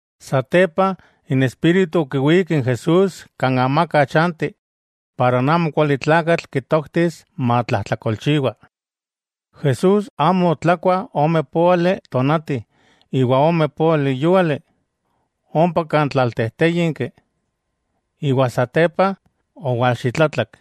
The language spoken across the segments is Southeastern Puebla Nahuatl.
Satepa, n Espíritu okiwík n Jesús kan amaka chanti para n amokualitlakatl kitoktis matlajtlakolchiwa. Jesús amo otlakua ome póali tonati iwa ome póali yúali, ompa kan amaka chanti, iwa satepa owalxitlatlak.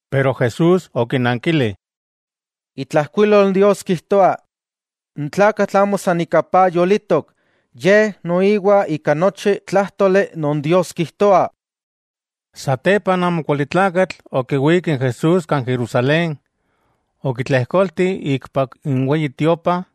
Pero Jesús okinankili: —Itlajkuilol Dios kijtoa: “N tlakatl amo san ika paj yolitok, yej noiwa ika nochi tlájtoli non Dios kijtoa.” Satepa n amokualitlakatl okiwík n Jesús kan Jerusalén, okitlejkolti ikpak n Weyi Tiopa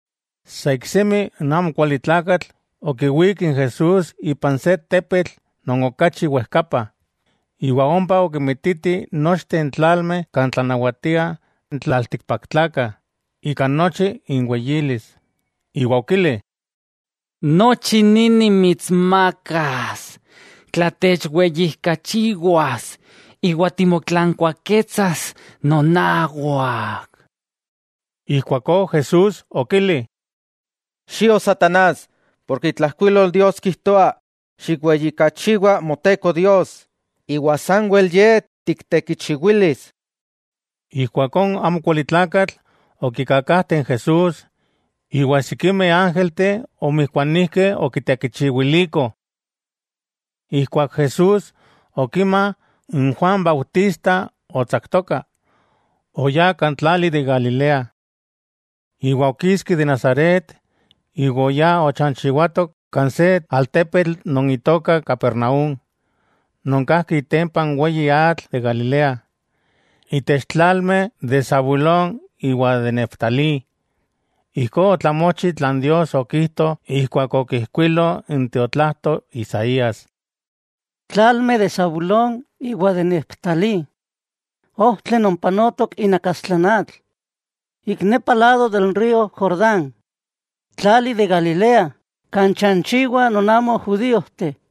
Sa iksemi n amokualitlakatl okiwík n Jesús ipan se tepetl non okachi wejkapa, iwa ompa okimititi nochteh n tlalmeh kan tlanawatiah n tlaltikpaktlakah ika nochi inweyilis, iwa okili: —Nochi ni nimitsmakas, tla techweyijkachiwas iwa timotlankuaketsas nonawak. Ijkuakó Jesús okili: —¡Xio, satanás!, porke itlajkuilol Dios kijtoa: “Xikweyijkachiwa Moteko Dios, iwa sanwel Ye tiktekichiwilis.” Ijkuakó n amokualitlakatl okikakajte n Jesús, iwa sikimeh ángelteh omijkuanijkeh okitekichiwilikoh. Ijkuak Jesús okima n Juan Bautista otsaktoka, oyá kan tlali de Galilea. Okiski de Nazaret, iwa oyá ochanchiwato kan se altepetl non itoka Capernaúm, non kajki itempa n weyi atl de Galilea, itech tlalmeh de Zabulón iwa de Neftalí. Ijkó otlamochi tlan Dios okijto ijkuak okijkuilo n tiotlajto Isaías: Tlalmeh de Zabulón iwa Neftalí, ojtli non panotok inakastla n atl, ik nepa lado de n río Jordán, tlali de Galilea kan chanchiwah non amo judíojteh.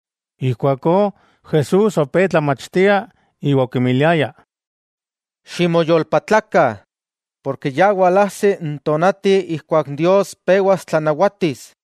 Ijkuakó, Jesús opé tlamachtia, iwa okimiliaya: —Ximoyolpatlakah, porke ya walajsi n tonati ijkuak Dios pewas tlanawatis.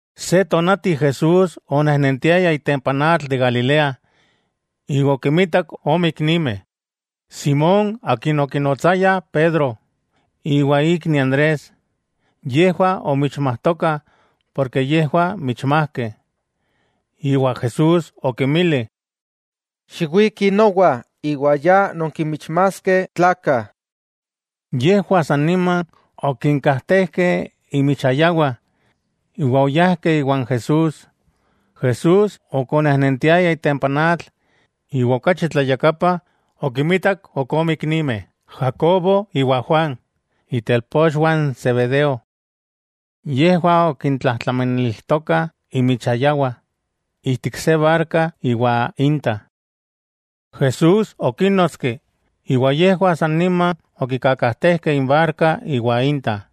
Se tonati Jesús onejnentiaya itempa n atl de Galilea, iwa okinmitak ome iknimeh, Simón akin okinotsayah Pedro iwa ikni Andrés. Yejwah omichmajtokah porke yejwah michmajkeh, iwa Jesús okinmili: —Xiwikih nowa, iwa ya nonkinmichmaskeh tlakah. Yejwah sa nima okinkajtejkeh inmichayawah iwa oyajkeh iwan Jesús. Jesús ok onejnentiaya itempa n atl, iwa okachi tlayakapa okinmitak ok ome iknimeh, Jacobo iwa Juan, itelpochwah n Zebedeo. Yejwah okintlajtlamanilijtokah inmichayawah ijtik se barka iwan inta. Jesús okínnotski, iwa yejwah sa nima okikakajtejkeh inbarka iwa inta,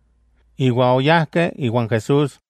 iwa oyajkeh iwan Jesús.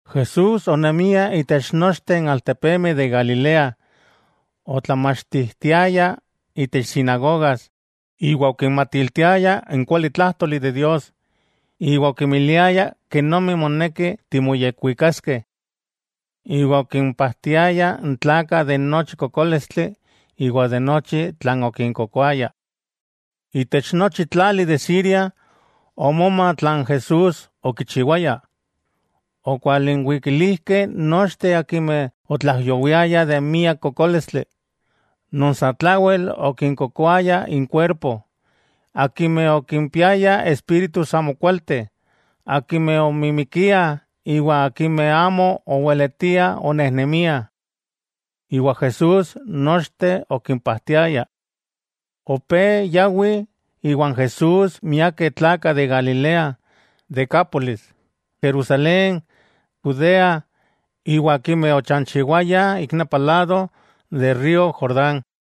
Jesús onemia itech nochteh n altepemeh de Galilea, otlamachtijtiaya itech sinagogas iwa okinmatiltiaya n kualitlájtoli de Dios iwa okimiliaya kenomi moneki timoyekuikaskeh. Iwa okimpajtiaya n tlakah de nochi kokólistli iwa de nochi tlan okinkokoaya. Itech nochi tlali de Siria, omoma tlan Jesús okichiwaya, okwalinwikilijkeh nochteh akimeh otlaijyowiayah ika miak kokólistli: non satlawel okinkokoaya inkuerpo, akimeh okimpiayah espíritus amokualteh, akimeh omimikiah iwa akimeh amo oweletiah onejnemiah. Jesús nochteh okimpajtiaya. Opé yawih iwan Jesús miakeh tlakah de Galilea, Decápolis, Jerusalén, Judea iwa akimeh ochanchiwayah ik nepa lado de río Jordán.